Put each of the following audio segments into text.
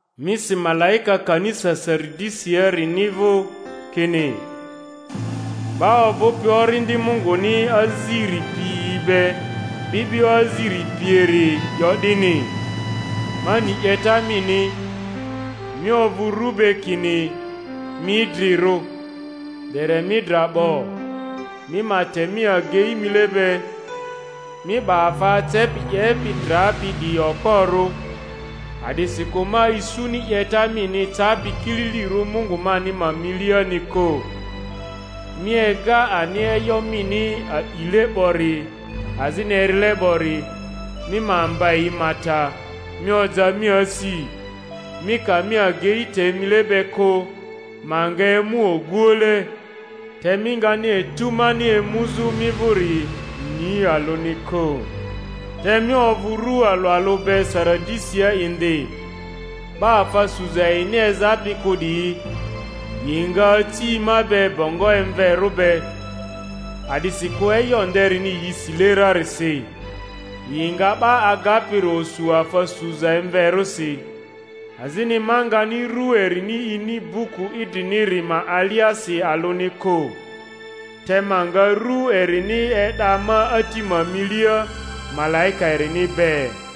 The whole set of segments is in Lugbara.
Mi si malaika kanisa Saridisiarini vᴜ kini: 'Ba ovᴜpi Orindi Munguni aziri piyi be, 'bi'bio aziri pieri 'yo 'dini: Ma ni 'yeta mini; mi ovᴜ ru be kini mi idrirᴜ, dere mi dra 'bo. Mi ma te mi agei mile be, mi 'ba afa acepi 'yepi drapi 'diyi okporᴜ, a'disikᴜ ma isuni 'yeta mini capi kililirᴜ Mungu mani ma miliani kᴜ. Mi ega ani e'yo mini a'ile 'bori azini erile 'bori; mi ma mba yi ma ta, mi oja mi asi. Mi ka mi agei te mile be kᴜ, ma nga emu oguoule, te mi ngani etu mani emuzᴜ mi vᴜri ni alᴜni kᴜ. Te mi ovᴜ ru alᴜ alᴜ be Saridisia indi, 'ba afa suza yini ezapi kᴜ 'diyi; yi nga aci ma be bongo emverᴜ be, a'disikᴜ e'yo nderini yi sile rarisi. Yi nga 'ba agapiri osu afa suza emverᴜsi, azini ma ngani ru erini ini buku idriniri ma aliasi alᴜni kᴜ; te ma nga rᴜ erini e'da ma Ati ma milia, malaika erini be.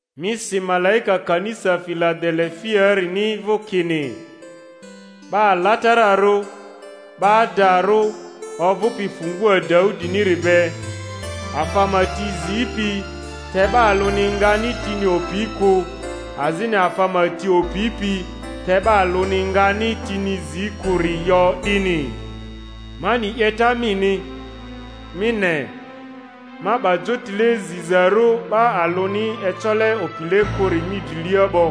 Mi si malaika kanisa Filadele-fiaarini vᴜ kini: 'Ba alatararᴜ, 'ba adarᴜ, ovᴜpi fungua Daudiniri be, afa ma ti zipi te 'ba alᴜni ngani tini opi kᴜ, azini afa ma ti opipi te 'ba alᴜni ngani tini zi kᴜri 'yo 'dini: Ma ni 'yeta mini. Mi ne, ma 'ba jotile zizarᴜ 'ba alᴜni ecole opile kᴜri mi drilia 'bo;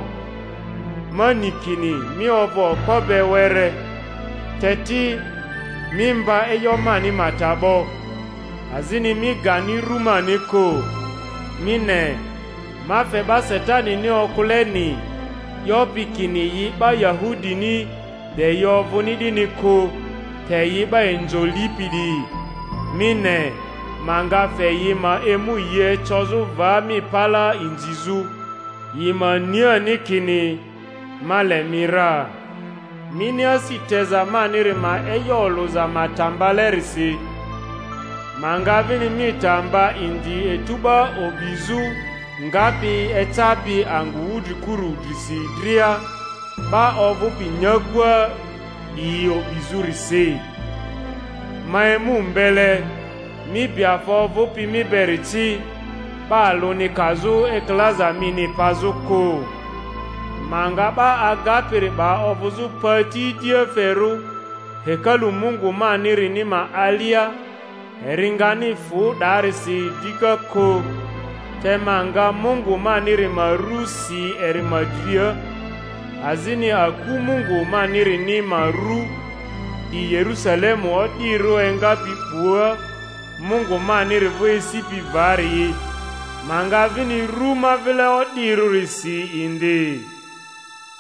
ma ni kini mi ovᴜ okpo be were, te ti mi mba e'yo mani ma ta 'bo, azini mi gani rᴜ mani kᴜ. Mi ne, ma fe 'ba Satanini okᴜleni, 'yopi kini yi 'ba Yahudini de yi ovᴜni 'dini kᴜ, te yi 'ba inzo lipi 'diyi —mi ne, ma nga fe yi ma emu yi ecozᴜ va mi palaa inzizᴜ, yi ma ni ani kini ma le mi ra. Mini asi teza maniri ma e'yo olᴜza ma ta mbalerisi, ma nga vini mi ta mba indi etu 'ba o'bizᴜ ngapi ecapi angᴜ wudrikuru drisi dria, 'ba ovᴜpi nyakua 'diyio'bizᴜrisi. Ma emu mbele; mi bi afa ovupi mi beri ci, 'ba alᴜni kazᴜ ekilaza mini pazᴜ kᴜ. Ma nga 'ba agapiri 'ba ovᴜzᴜ pati idiaferᴜ hekalu Mungu manirini ma alia; eri ngani fᴜ 'daarisi dika kᴜ, te ma nga Mungu maniri ma ru si eri ma dria, azini aku Mungu manirini ma ru, 'di Yerusalemu o'dirᴜ engapi 'bua Mungu maniri vᴜ esipi varii, ma nga vini rᴜ ma vile o'dirᴜri si indi,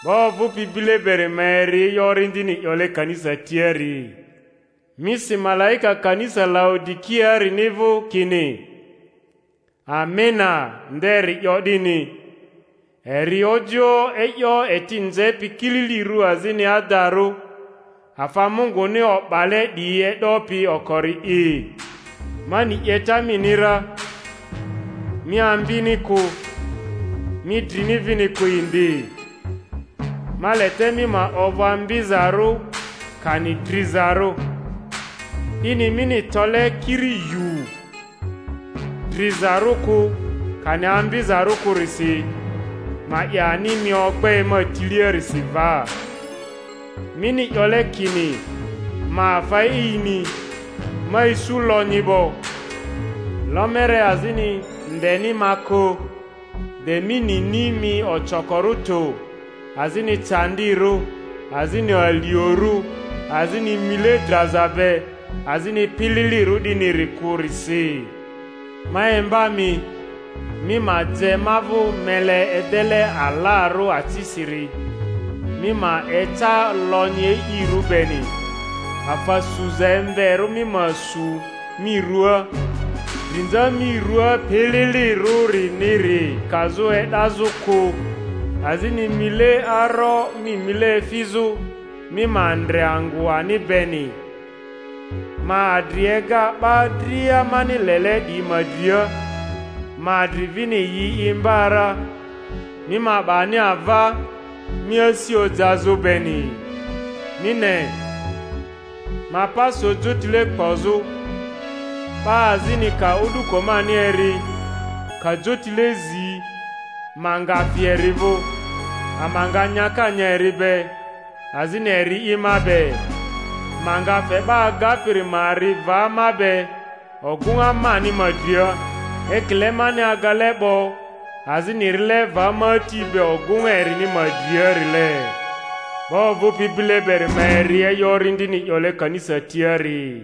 'Ba ovᴜpi bile beri ma eri e'yo Orindini 'yole kanisa tiari. Mi si malaika kanisa Laodi-kiaarini vᴜ kini: Amena nderi 'yo 'dini, eri ojioᴜ e'yo eti nzepi kililirᴜ azini adarᴜ, afa Munguni o'bale 'diyi e'dopi okori'i: Ma ni 'yeta mini ra, mi ambini kᴜ, mi drini vini kᴜ indi. Ma le te mi ma ovᴜ ambizarᴜ kani drizarᴜ! 'Dini mini tole kiri yuu, drizarᴜ kᴜ kani ambizarᴜ kᴜrisi, ma 'ye ani mi ogbe ma tiliarisi va. Mini 'yole kini, Ma afa e'ini, ma isu lonyi 'bo, lomere azini ndeni ma kᴜ; de mi nini mi ocokorᴜ tᴜ, azini candirᴜ, azini aliorᴜ, azini mile draza be, azini pililirᴜ 'diniri kᴜrisi, ma imba mi, mi ma je ma vᴜ mele edele alarᴜ acisiri, mi ma eca lonyi e'irᴜ beni; afa suza emverᴜ mi ma su mi ruaa, drinza mi rua pililirᴜriniri kazᴜ e'dazᴜ kᴜ; azini mile aro mi mile efizᴜ, mi ma ndre angᴜ ani beni. Ma adri ega 'ba dria mani lele 'diyi ma dria, ma adri vini yi imba ra; mi ma 'ba ani ava, mi asi ojazᴜ beni. Mi ne, ma pa so jotile kpozᴜ; 'ba azini ka o'duko mani eri, ka jotile zi, ma nga fi eri vᴜ, ama nga nyaka nya eri be, azini eri'i ma be. Ma nga fe 'ba agapiri ma ri va ma be ogᴜŋa mani ma dria, ekile mani agale 'bo azini rile va ma Ati be ogᴜŋa erini ma driarile. 'Ba ovᴜpi bile beri ma eri e'yo Orindini 'yole kanisa tiari.